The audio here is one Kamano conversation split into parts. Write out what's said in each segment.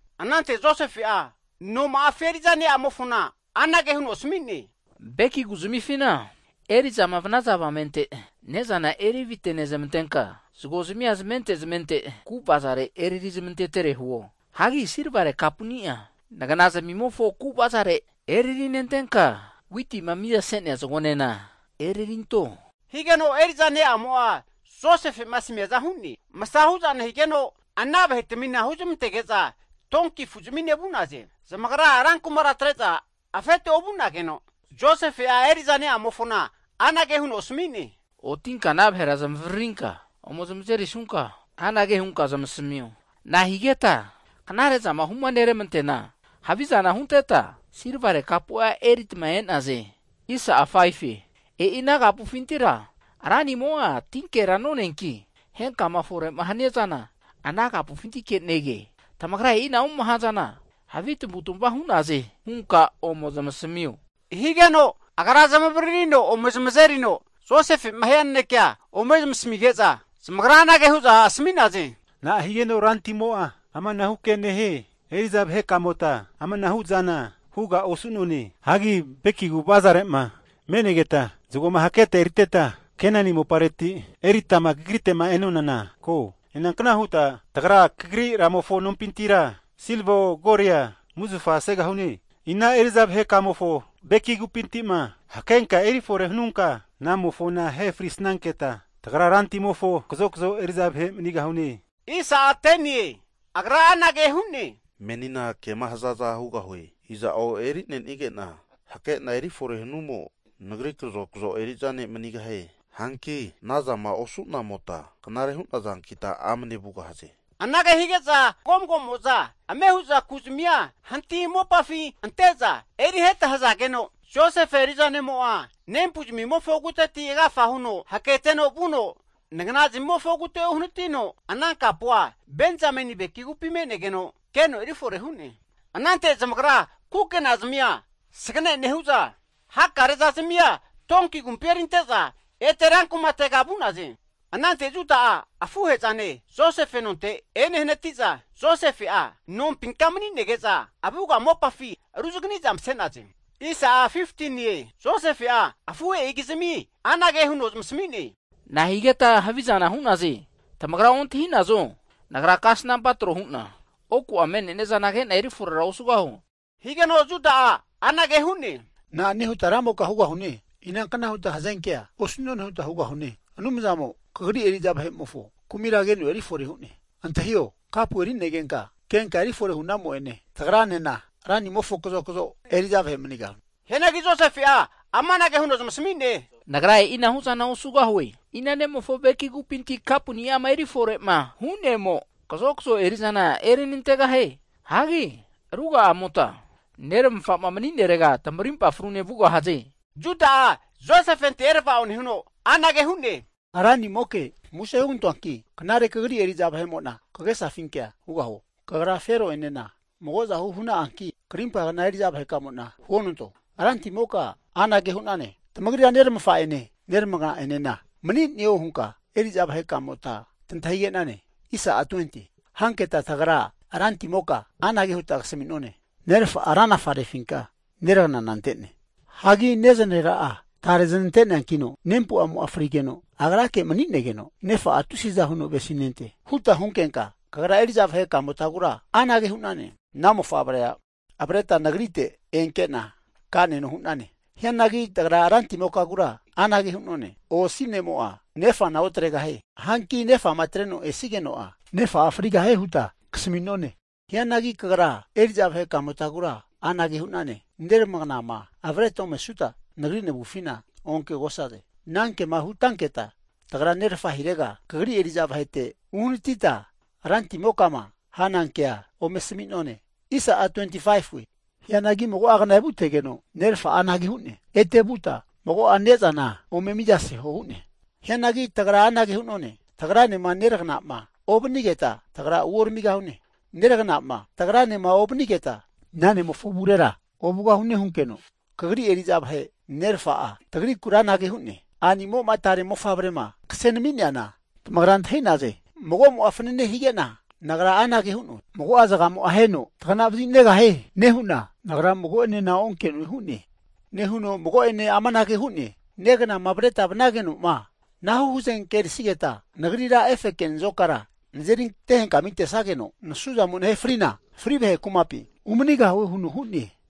Anante Josefe'a noma'afi eri'za ne'amofona anage huno asmi'ne, Beki ku'zmifina eri'zama vanaza avamente ne'zana erivite nezmantenka, zago'zmia zamente zamente ku avazare eriri zamantetere huo. Hagi Silvare kapuni'a nagana zami'mofo ku avazare eriri nentenka, witima mizase'nea zagonena eririnto, higeno eri'za ne'mo'a Josefe'ma asmiaza hu'ne. Masa hu'za nehigeno, ana vahetmina huzmantege'za donki zamine vu'naze. Zamagra rankumara atre'za afete ovu'nageno, Josefe'a eri'za ne'amofona anage huno asami'ne, Otinka ana vahera zamavaririnka ome zamazerisunka anage hunka zamasmio. Na'a higeta knare'zama huma neramanteana havizana hunteta silvare kapu'a erita e'naze? E'i ana kapufintira ranimo'a tinkera noneanki, henkama fore'ma hania zana ana kapufintike nege. Tamagra e'inahu'ma hazana havi tamavu'tamava hu'naze hunka ome zamasamio. Higeno agra zamavaririno ome zamazerino, Josefe'ma hia nanekea ome zamasamige'za, Zamagra anage hu'za asmi'naze, Na'a higeno rantimo'a amanahu kea nehie? Eri'za vahe kamota amanahu'zana huga osu'none! Hagi beki ku avazare'ma me'negeta zagoma haketa eriteta Kenani mopareti eritama kagrite'ma e'nonana ko. Inankna huta kagri ramofo nompintira silivao, golia musufa segahune? Ina eri'za vahe kamofo beki kupinti'ma hakenka eri fore hanunka, ana mofona ahe frisnanketa, tagra rantimofo kazokazo eri'za vahe manigahune. Agra anage hu'ne, Menina kema hazaza hugahue, iza'o eri'nenige'na hakena eri fore hanumo nagri kazokazo eri'za ne' manigahie. Hanki anazama osu'namota knare hu'nazankita amne vugahaze. Anage hige'za mago mago'moza ame hu'za ku'zmia hanti mopafi ante'za, eri heta hazageno, Josefe eri'za ne'mo'a nempu'zmimofo kuteti agafa huno haketeno vuno nagna zamimofo kute uhanatino, ana kapua Benzameni beki kupi me'negeno keno eri fore hu'ne. Anante zamagra kukena zamia sagne nehu'za, hakarezazmia donki agumpi erinte'za ete rankumatega vu'naze. Anante Juda'a afuhe'zane Josefe nonte enehanati'za, Josefe'a nompinka mani'nege'za avuga mopafi ruzagani'za mase'naze. Josefe'a afuhe'ikizmi anage huno zamasmi'ne, na'a higeta havizana hu'naze? Tamagra ontahi'nazo, nagra kasnampa (divinesen) tro hu'na oku me'nenia'zana ke'na eri fore osugahuo? Higeno Juda'a anage hu'ne, na'ane huta ranimoka hugahune. Inankna huta hazenkea osu'none huta hugahune. Anumzamo kagri eri'za vahe'mofo kumira keno eri fore hu'ne, Antahio, kapu eri'negenka kenka eri fore hu'namo'ene tagranena ranimofo kazokzo eri'za vahe manigahune. Hianagi Josefe'a amanage huno zamasmi'ne, Nagra e'inahu'zana osugahue. Ina nemofo beki kupinti kapu ni'ama eri fore'ma hu'nemo, kazokazo eri'zana eri nantegahie. Hagi ruga'amota neramafa'ma mani'nerega tamarimpa frune vugahaze. Juda'a Josefente erava'o huno anage hu'ne, ranimoke, muse (plis) hugantoanki, knare kagri eri'za vahe'mo'na kagesafinkea hugahuo. Kagra, Fero'enena mago'zahu hu'na'anki, krimpa kna eri'za vahe kamo'na huonanto. rantimoka anage hu'nane, Tamagrira neramafa'ene neramagna enena mani'neo hunka eri'za vahekamota tantahige'nane? Hanketa tagra rantimoka anage huta kasami'none, nerafa'a ranafa refinka neraganana ante'ne. Hagi nezanarera'a tare zanante'neankino nempu'amo'a frigeno, agrake mani'negeno, nefa'a tusiza huno avesinente. Huta hunkenka kagra eri'za vaheka'motagura anage hu'nane, ana mofavrea avreta nagrite enke'na ka'neno hu'nane. Hianagi tagra ranti'mokagura anage hu'none, osi ne'mo'a nefana otregahie. Hanki nefama atreno esigeno'a nefa'a frigahie huta kasmi'none. Hianagi kagra eri'za vahekamotagura anage hu'nane, neramagnama avreta omesuta, nagri navufina onke'gosaze. Anankema hutanketa tagra nerfa hirega kagri eri'za vahete uhanatita, rantimokama hana kea ome asmi'none. Hagi mago'a kna evutegeno nerafa'a anage hu'ne, ete vuta mago'a ne'zana ome miza seho hu'ne. Hianagi tagra anage hu'none, tagranema neragana'ma ovanigeta, tagra uoramigahune. Neragana'ma tagranema ovanigeta ana ne'mofo avurera ovugahune hunkeno, kagri eri'za vahe nerafa'a tagrikura anage hu'ne, a'nimo'ma tare ne'mofavrema kase nami'neana tamagra antahi'naze. Mago'mo'a fanane hige'na nagra anage hu'noe, mago'a zagamo aheno tagana vazinegahie nehu'na, nagra mago'enena onke'noe hu'ne. Nehuno mago'ene amanage hu'ne, Neganama avreta vanageno'ma, anahu hazenke erisigeta, nagrira efe nazokara nazeri ante henkma tesageno nasuzamo nahe frina, fri vahe kumapi (Seol) umanigahue huno hu'ne.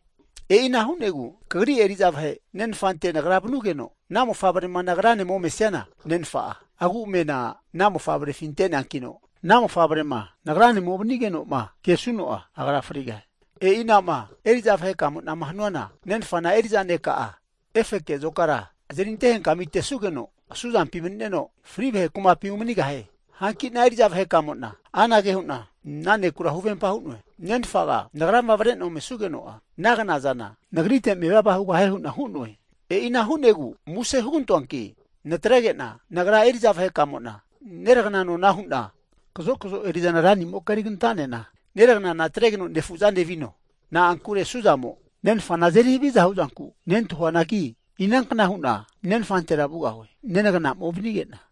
E'inage hu'negu kagri eri'za vahe nenfante nagra vanugeno, ana mofavrema nagrane omesiana, nenfa'a agu'amena ana mofavrefi ante'neankino, ana mofavrema nagranema ovanigeno'ma kesuno'a agra frigahie. E'inama eri'za vahe ka'mona hanuna, nenfana eri'za ne' ka'a efe azokara azeri ante henkma antesugeno asuzampi mani'neno, fri vahe kumapi (Seol) umanigahie. Hanki'na eri'za vahe'kamo'na anage hu'na ana nekura huvempa hu'noe, nenfaga nagrama avre'na omesugeno'a ana knazana nagrite mevava hugahie hu'na hu'noe. E'ina hu'negu muse (plis) hugantoanki natrege'na nagra eri'za vahe kamo'na neragna nona hu'na kazo kazo eri'zana ranimoka eriganta'nena, neragnana atregeno nefuzane vino. Na'ankure asuzamo nenfana azeri haviza huzanku nentahuanagi, inankna hu'na nenfantera vugahue nenagnama ovanige'na?